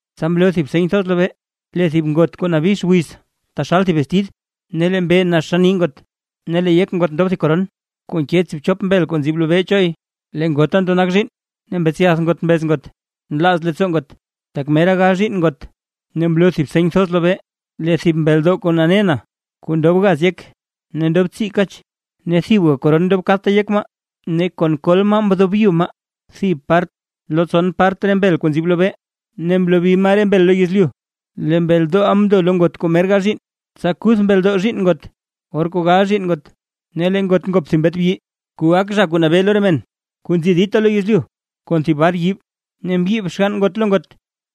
Tsa mloo thib seny thoz lobee, lee thib ngot kuu nabix wiz taxal thib bestid, ne lee mbee nax xann nii ngot, ne lee yek ngot ndob thib koron kuu nke tsiibchop mbel kuu nzib lobee choy. Lee ngota ndo nak zhiinn, ne mbetsyath ngot mbez ngot nlaaz leettsoo ngot, tak mera gal zhiinn ngot. Ne mloo tedib seny thoz lobee, lee thib mbeldoo kuu nane na kuu ndob gaz yek ne ndob tsii kach, ne thibga koron ndob kadta yek maa. Ne kon kol maa mdobyu maa thib part lo tson part re mbel kuu nzib lobee, ne mlobi maa re mbel lo yezlyu. Lee mbeldooʼa mndo lo ngot kuu mer gal zhiinn, tsa kuth mbeldoo zhiinn ngot, or kuu gal zhiinn ngot. Ne lee ngot ngop thib mbet bi, kuu gak zha kuu nabee lo re men kuu nzi dita lo yezlyu kon thib bar yiib. Ne mbyiib xgann ngot lo ngot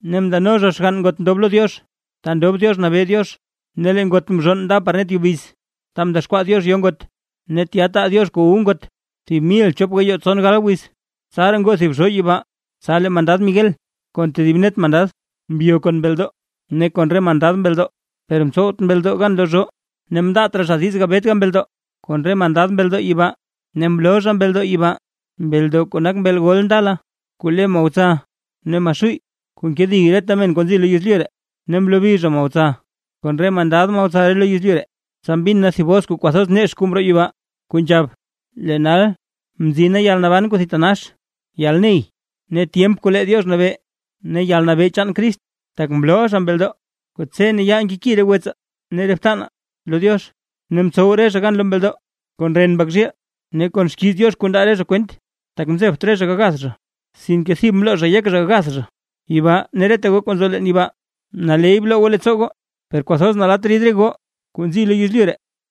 ne ndano zha xgann ngot mndob lo Diox ta ndob Diox nabee Diox; ne lee ngot mzhonn nda par net yubiz, ta mdexkwaa Diox yo ngot, ne tya taa Diox kuu wu ngot thib mil chop gayoo tson gal wiz. Tsaraa ngoo thib zhoo yibaa, tsa lee mandad Miguel kon tedib net mandad mbyo kon mbeldoo ne kon re mandad mbeldoo, per mtsowt mbeldoo gan lo zhoo; ne mndaat raa zha diiz gabet mbeldoo kon re mandad mbeldoo yibaa. Ne mloo zha mbeldoo yibaa, mbeldoo kuu nak mbeel gol ndala kuu le Mahotsa ne Maxuuy, kuu nkedi reta men kuu nzi lo yezlyu. Ne mlobi zha Mahotsa kon re mandad Mahotsa lo yezlyu. Tsa mbin na thib bos kuu kwathoz nex kuu mroo yibaa, kuu nzhab: Lee nal mzina yalnaban kuu thitanax, yalney ne tyemp kuu lee Diox nabee, ne yalnabee chaan Crist, tak mlooʼa zha mbeldoo, kuu tse ne yaal nkeki re wetsaa ne re btanaa lo Diox. Ne mtsow re zha gan lo mbeldoo kon ren Mbak zhiil, ne kon xkiiz Diox kuu ndaa re zha kwent; tak mzebt re zha gagath zha, sinke thib mloo zha yek zha gath zha. Yibaa ne reta goo kuu nzo leen yibaa, naley bloo goo leettsoo goo. ¡Per kwathoz nalatt rid re goo kuu nzi lo yezlyu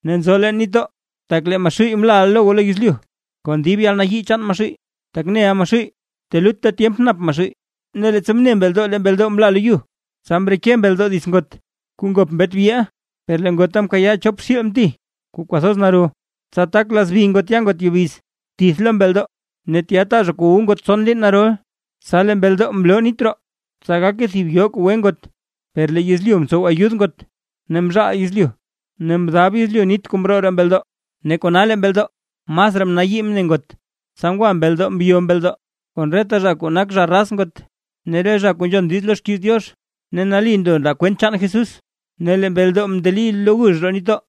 ne nzo leen nitdoo! Tak lee Maxuuy mlaʼa lo goo lo yezlyu, kon dib yalnayii chaan Maxuuy, tak neʼa Maxuuy telutta tyemp nap Maxuuy. Ne leettsa mne mbeldoo lee mbeldoo mla lo yu, tsa mreke mbeldoo dits ngot kuu ngop mbet biʼa. Per lee ngota mkayaa chop xiil mti kuu kwathoz naro, tsa tak lazbi ngot ya ngot yubiz, tith lo mbeldoo, ne tya taa zha kuu wu ngot tson liin narol. Tsa lee mbeldoo mloo nit roo, tsa gake thib yoo kuu gwe ngot; per lee yezlyu mtsow ayud ngot, ne mzhaal yezlyu ne mdab yezlyu nit kuu mroo roo mbeldoo. Ne kona lee mbeldoo masraa mnayii mne ngot, tsa ngwa mbeldoo mbyo mbeldoo kon reta zha kuu nak zha raz ngot, re zha kuu nzhon diiz lo xkiiz Diox, ne nali ndo ndaa kwent chaan Jesucrist. Ne lee mbeldoo mndeli lo gux roo nitdoo.